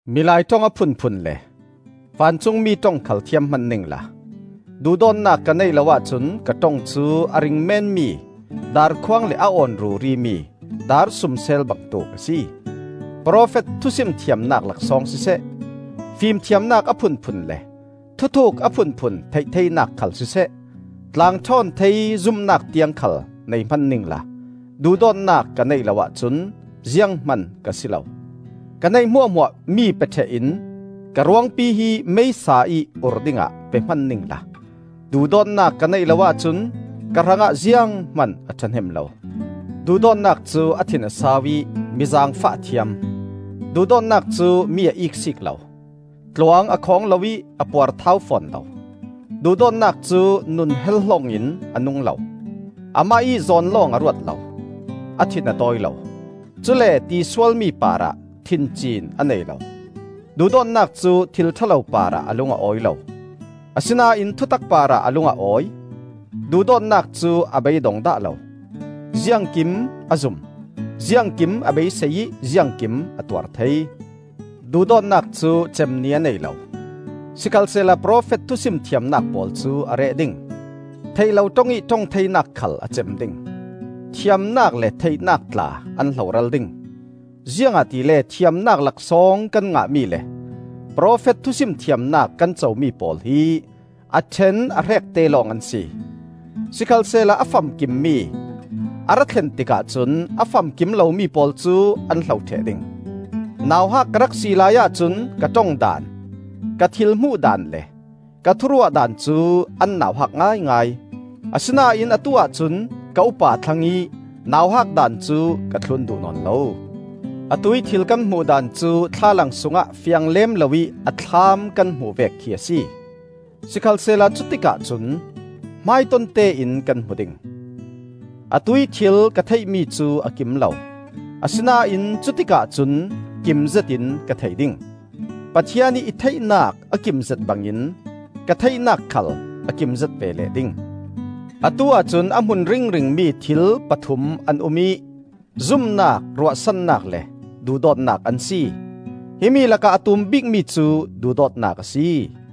Milai ṭong a phunphun le vancungmi ṭong khal thiam hman ningla duhdawtnak ka neih lo ahcun ka ṭong cu a ring meenmi darkhuang le a awn rurimi darsumsel bangtuk a si. Profet thusim thiamnak laksawng siseh, fimthiamnak a phunphun le thuthuuk a phunphun theih theinak khal siseh, tlang ṭhawn thei zumnak tiang khal nei hman ningla duhdawtnak ka neih lo ahcun zianghman ka si lo. Ka neih hmuahhmuah mi pe ṭheh in ka ruangpi hi meisa ih ur dingah pe hman ningla duhdawtnak ka neih lo ahcun ka hrangah zianghman a ṭhahnem lo. Duhdawtnak cu a thin a sau ih mi zaangfah a thiam; duhdawtnak cu mi a iksiik lo, tluang a khawng lo ih a puarthau fawn lo. Duhdawtnak cu nun hel-hlong in a nung lo, amah ih zawn lawng a ruat lo, a thin a tawi lo, cule tisual mi parah thinciin a nei lo. Duhdawtnak cu thil ṭha lo parah a lung a awi lo, asinain thutak parah a lung a awi. Duhdawtnak cu a bei a dong dah lo; ziangkim a zum, ziangkim a beisei ih ziangkim a tuar thei. Duhdawtnak cu cem ni a nei lo. Sikhalsehla profet thusim thiamnak pawl cu a reh ding; theih lo ṭong ih ṭong theinak khal a cem ding. Thiamnak le theihnak tla an hloral ding. Ziangahtile thiamnak laksawng kan ngahmi le profet thusim thiamnak kan comi pawl hi a ṭhen a hrekte lawng an si. Sikhalsehla a famkimmi a ra thlen tikah cun a famkim lomi pawl cu an hlo ṭheh ding. Nauhak ka rak si laiah cun ka ṭong daan, ka thil hmuhdan le ka thuruahdan cu an nauhak ngaingai. Asinain atuah cun ka upa thlang ih nauhak daan cu ka thlun duh nawn lo. Atuih thil kan hmuhdan cu thlalang sungah fiang lem loih a thlam kan hmuh vek khi a si; sikhalsehla cutikah cun hmaitontein kan hmu ding. Atuih thil ka theihmi cu a kim lo; asinain cutikah cun kim zetin ka thei ding. Pathian ih i theihnak a kimzet bangin ka theihnak khal a kimzet ve leh ding. Atu-ah cun a hmun ringringmi thil pathum an um ih zumnak, ruahsannak le duhdawtnak an si; himi lakah a tum bikmi cu duhdawtnak a si.